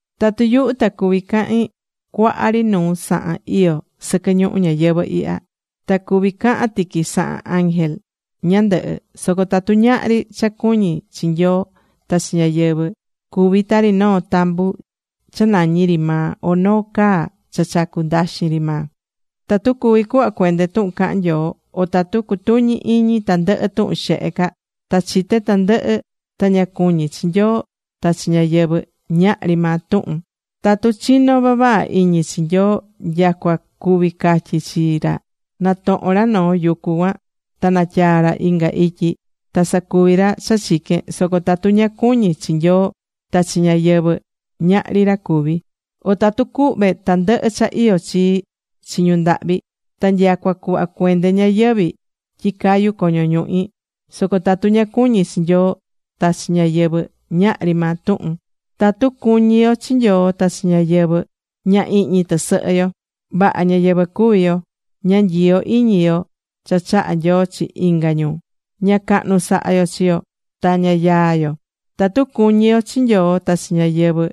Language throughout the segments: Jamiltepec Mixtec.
Tatu yuhu ta cuví cahin cuaha ri nuu sahan iyó sɨquɨ ñuhu ñayɨvɨ̱ ihya, ta cuví cahan tiqui sahan ángel ñandɨhɨ, soco tatu ñahri cha cuñí chi Nyoo ta chi ñáyɨvɨ, cuví tari noo tambu cha nañí ri maa o noo caa cha chacú ndaxin ri maa. Tatu cuví cuhva cuende tuhun cahan Nyoo, o tatu cutuñí iñi tandɨhɨ tuhun xehe ca, ta chité tandɨhɨ, ta ña cuñí chi Nyoo ta chi ñáyɨvɨ, ñahri maa tuhun. Tatu chinó vavaha iñi chi Nyoo nyacua cuví catyi chi ra na tohon ra noo yucu cuan ta natyaa ra inga ityi, ta sacuví ra cha chiquén, soco tatu ña cuñí chi Nyoo ta chi ñáyɨvɨ, ñahri ra cuví. O tatu cuhve tandɨhɨ cha iyó chii chi ñu ndahvi, ta nyacua cuhva cuende ñayɨvi̱ tyi cayu coño ñuhi, soco tatu ña cuñí chi Nyoo ta chi ñáyɨvɨ, ñahri maa tuhun. Tatu cuñí yo chi Nyoo ta chi ñáyɨvɨ, ña ihñi tɨsɨhɨ yo. Vaha ñáyɨvɨ cuví yo. Ña nyiyó iñi yo cha chahá Nyoo chi inga ñu, ña cahnu sahá yo chi yo, ta ña yaá yo. Tatu cuñí yo chi Nyoo ta chi ñáyɨvɨ,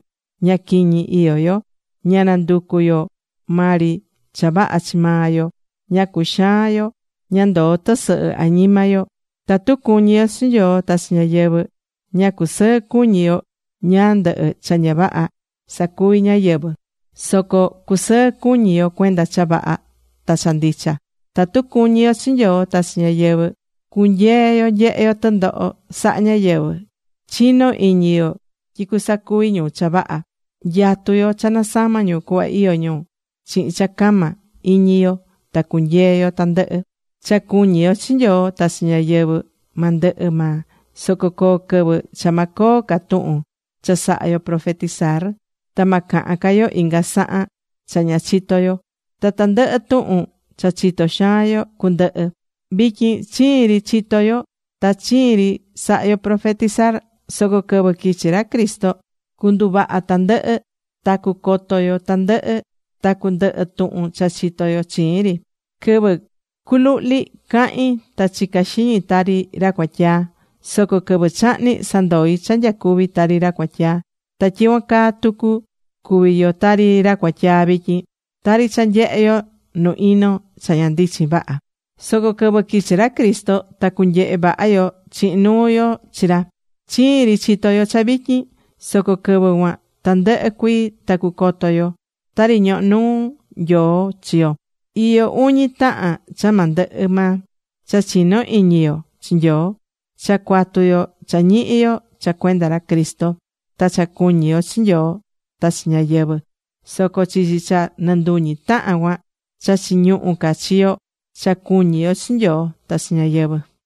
ña quiñi iyó yo. Ña nanducú yo maa ri cha vaha chi maa yo. Ña cuxaán yo. Ña ndoó tɨsɨhɨ añima yo. Tatu cuñí yo chi Nyoo ta chi ñáyɨvɨ, ña cusɨɨ cuñí yo ñáá ndɨhɨ cha ña vaha sacuví ñáyɨvɨ. Soco cusɨɨ cuñi yo cuenda cha vaha ta cha ndicha. Tatu cuñí yo chi Nyoo ta chi ñáyɨvɨ, cunyeé yo nyehe yo tɨndoho sahá ñáyɨvɨ. Chinó iñi yo tyi cusacuvi ñu cha vaha. Nyatú yo cha nasama ñu cuhva iyó ñu. Chihin cha cama iñi yo ta cunyee yo tandɨhɨ. Cha cuñí yo chi Nyoo ta chi ñáyɨvɨ ma ndɨhɨ maa, soco coo quɨvɨ cha ma coo ca tuhun cha sahá yo profetizar. Ta ma cahan ca yo inga sahan cha ña chitó yo, ta tandɨhɨ tuhun cha chitó xaan yo cundɨhɨ. Vityin chiin ri chitó yo ta chiin ri sahá yo profetizar. Soco quɨvɨ quichi ra Cristo, cunduvaha tandɨhɨ ta cucoto yo tandɨhɨ, ta cundɨhɨ tuhun cha chitó yo chiin ri. Quɨvɨ cu luhli̱ cahi̱n ta chica̱ xiñi tari ra cuatyaa. Soco quɨvɨ chahni̱ sandoi̱ cha nyacuvi̱ tari ra cuatyaa. Ta tyicuan caa tucu, cuví yo tari ra cuatyaa vityin. Tari cha nyehé yo nu ino cha ña ndichin vaha. Soco quɨvɨ quichi ra Cristo ta cunyehe vaha yo chihin nuu yo chi ra. Chiin ri chitó yo cha vityin. Soco quɨvɨ cuan tandɨhɨ cuii ta cucoto yo, tari ñohó nuu Nyoo chi yo. Iyó uñi tahan cha ma ndɨhɨ maa: cha chinó iñi yo chi Nyoo, cha cuatu yo cha ñihí yo cha cuenda ra Cristo, ta cha cuñí yo chi Nyoo ta chi ñáyɨvɨ. Soco chichi cha nɨnduñi tahan cuan, cha chiñuhú ca chi yo, cha cuñí yo chi Nyoo ta chi ñáyɨvɨ.